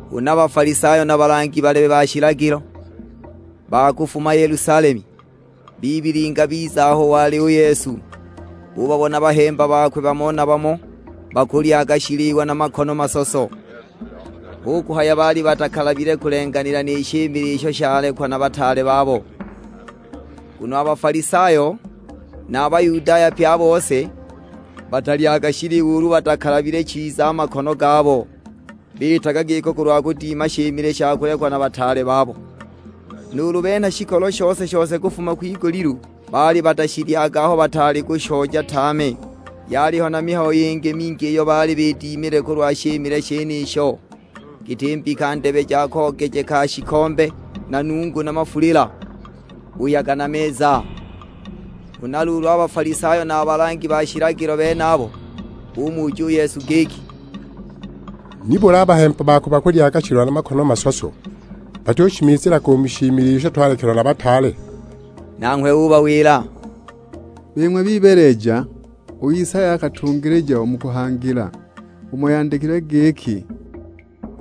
Huna Bafalisayo na balangi balebe ba shilagilo, ba kufuma Yelusalemu, bibilinga biza aho wali u Yesu. Bubabona bahemba bakwe bamo na bamo bakulyaga shiliwa na makono masoso, hu kuhaya baali batakalabile kulenganila na shimile isho shalekwa na bataale babo. (Nguno a Bafalisayo, na a Bayudaya pye a bose, batalyaga shiliwa ulu batakalabile chiza a makono gabo. Biitaga giko kulwa kudima shimile sha kulekwa na bataale babo. Nuulu benha shikolo shose-shose kufuma kwigulilu, baali batashilyaga aho bataali kushooja tame. Yaliho na mihayo yingi mingi iyo baali bidimile kulwa shimile shenisho: giti mbika ndebe ja koogeje ka shikombe na nungu na mafulila, buyaga na meza!) Huna luulu a Bafalisayo na a balangi ba shilagilo benabo, bumuja u Yesu giki, "Nibuli a bahemba bako bakulyaga shiliwa na makono masoso, batushimizilaga u mu shimile isho twalekelwa na bataale?" Nanghwe ubawila, "Bing'we bibeeleja, u Isaya akatungilija u kumuhangila, umo yandikililwe giki,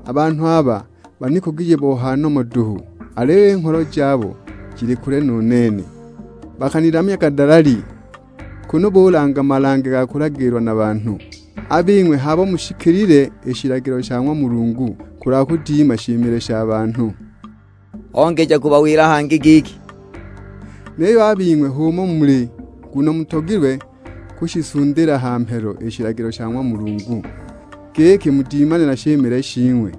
'A banhu aba banikugije bo ha nomo duhu, aliyo i ngholo jabo jili kule nu nene. Bakanilamyaga dalali, kunu bulanga malange ga kulagilwa na banhu.' A bing'we h'abo mushilekile i shilagilo sha ng'wa Mulungu kulwa kudima shimile sha banhu!" Ongeja kubawila hangi giki, "Niyo a bing'we h'umo muli, nguno mutogilwe kushisundila ha mhelo i shilagilo sha ng'wa Mulungu, giki mudimane na shimile shing'we.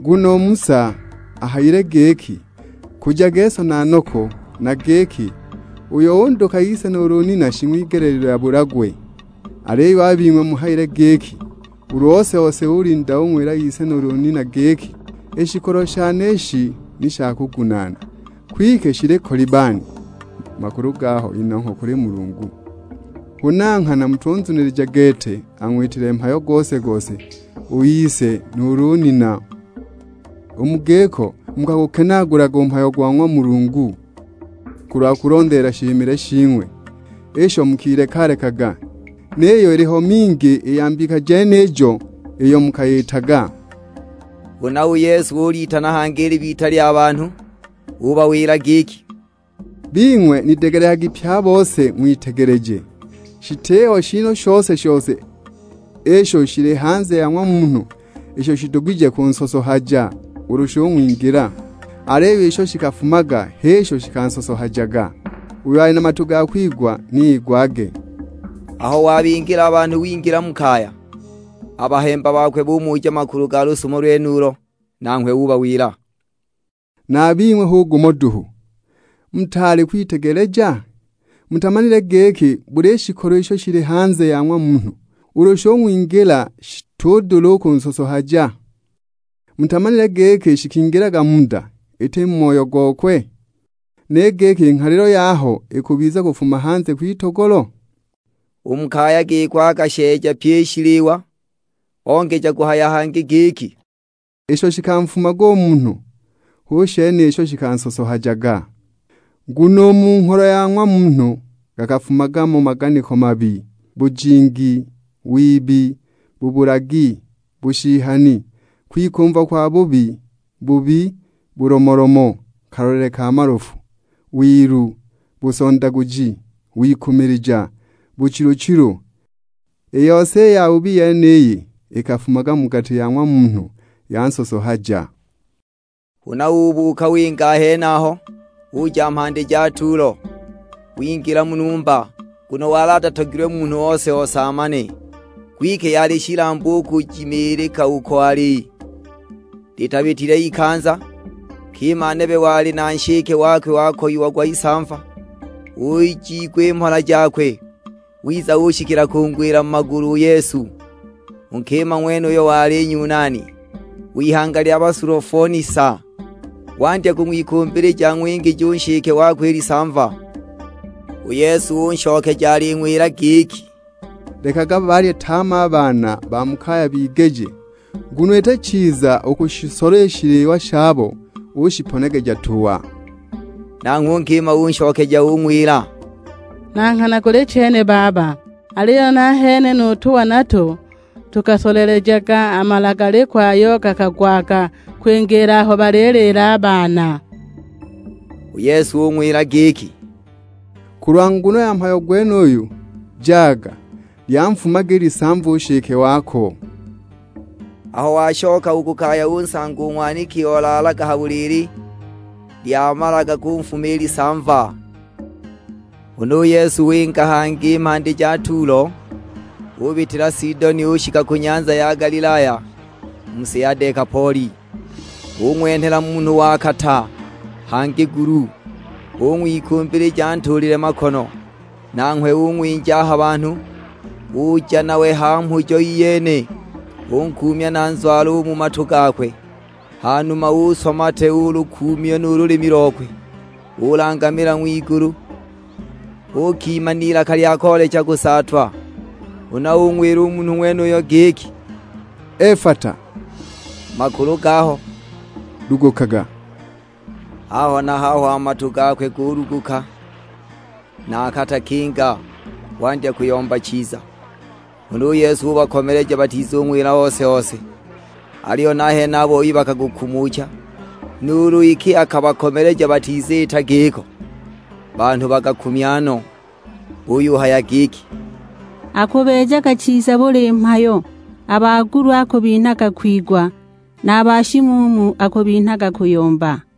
Nguno u Musa ahayile giki, 'Nkujage so na noko,' na giki, 'Uyo unduka ise nuulu nina shing'wigeleelilwe abulagwe!' Aliyo a bing'we muhayile giki, ulu ose-ose ulinda ung'wila ise nuulu nina giki, 'I shikolo shane ishi ni shakugunaana, kwike shili Kolibani (makulu gaho inongho kuli Mulungu);' huna nghana mutunzunilija gete ang'witile mhayo gose-gose u ise nuulu u nina! U mu giko mukagukenaagulaga u mhayo go ng'wa Mulungu kulwa kulondeela shimile shing'we, isho mukilekela-lekelaga, niyo iliho mingi i ya mbika jenijo iyo mukayitaga." Huna u Yesu ulitana hangi i libita lya banhu, ubawila giki, "Bing'we nidegelekagi pye a bose ng'witegeleje. Shitiho shose-shose isho shili hanze ya ng'wa munhu isho shidugije kunsosohaja ulu shung'wingila, aliyo isho shikanfumaga h'isho shikansosohajaga. [ Uyo ali na matu gakigwaga ni igwage.]" Aho wabingila a banhu wingila mu kaya, a bahemba bakwe bumuja a makulu ga lusumo lwenulo. Nanghwe ubawila, "Na a bing'we hu gumo duhu, mutaali u kwitegeleja? Mutamanile giki, buli shikolo isho shili hanze ya ng'wa munhu ulu shung'wingila shitudula u kunsosohaja? Mutamanile giki shikingilaga mu nda, iti mu moyo gokwe? Ni giki i nghalilo yaho ikabizaga kufuma hanze kwitogolo?" (U mu kuhaya giko akasheeja pyi i shiliwa). Ongeja kuhaya hangi giki, "Isho shikanfumaga u munhu, hu shene isho shikansosohajaga. Nguno u mu ngholo ya ng'wa munhu, gakafumaga mo maganiko mabi, bujingi, wibi, bubulagi, bushihani, kwikumva kwabubi, bubi, bulomolomo, kalolele ka malofu, wilu, busondaguji, wikumilija, buchilu-chilu. I yose i yabubi yeniyi ikafumaga mu gati ya ng'wa munhu yansosohaja." Huna ubuuka winga a henaho, uja mhandi ja Tulo. Wingila mu numba, nguno wali atatogilwe munhu ose-ose amane; kwike yali shilambu u kujimilika uko wali. Litabitile ikanza, nkima nebe wali na nshike wakwe wakoyiagwa isamva; ujiigwa i mhola jakwe, wiza ushikila kungwila mu magulu u Yesu. U nkima ng'wenuyo wali Nyunani, w'ihanga lya Basulofonisa. Wandya kung'wikumbilija ang'wingije u nshike wakwe i lisamva. U Yesu unshokeja aling'wila giki, "Lekaga balye tame a baana ba mu kaya bigeje, nguno iti chiza u kushisola i shiliwa shabo ushiponegeja tuwa." Nanghwe u nkima unshokeja ung'wila, "Na nghana guli chene baba, aliyo nahene nu tuwa nato tukasolelejaga a malagalikwa ayo gakagwaga kwingiila aho baliliila a baana." U Yesu ung'wila giki, "Kulwa nguno ya mhayo gwenuyo, jaga; lyanfumaga i lisamva u nshike wako." Aho washoka u ku kaya unsanga u ng'waniki olaalaga ha buliili, lyamalaga kunfuma i lisamva. Huna u Yesu winga hangi i mhandi ja Tulo, ubitila Sidoni, ushika ku nyanza ya Galilaya, mu si ya Dekapoli. Bung'wenhela munhu wa kata, hangi gulu. Bung'wikumbilija antuulile makono. Nanghwe ung'winja a ha banhu, uja nawe ha mhujo iyene. Unkuumya na nzwala u mu matu gakwe, ha numa uswa mate ulukuumya nu lulimi lokwe. Ulangamila ng'wigulu, ukiima n'ilaka lya koolecha kusaatwa, huna ung'wila u munhu ng'wenuyo giki, "Efata," makulu gaho, "Lugukaga!" Haho na haho a matu gakwe guluguka, na a kata kinga, wandya kuyomba chiza. Huna u Yesu ubakomeleja batizung'wila ose-ose. Aliyo nahene a boi bakagukumucha, nuulu iki akabakomeleja batiziita giko. Banhu bakakumya no; buyuhaya giki, "Akubeejaga chiza buli mhayo, a bagulu akubinhaga kwigwa, na a bashimuumu akubinhaga kuyomba!"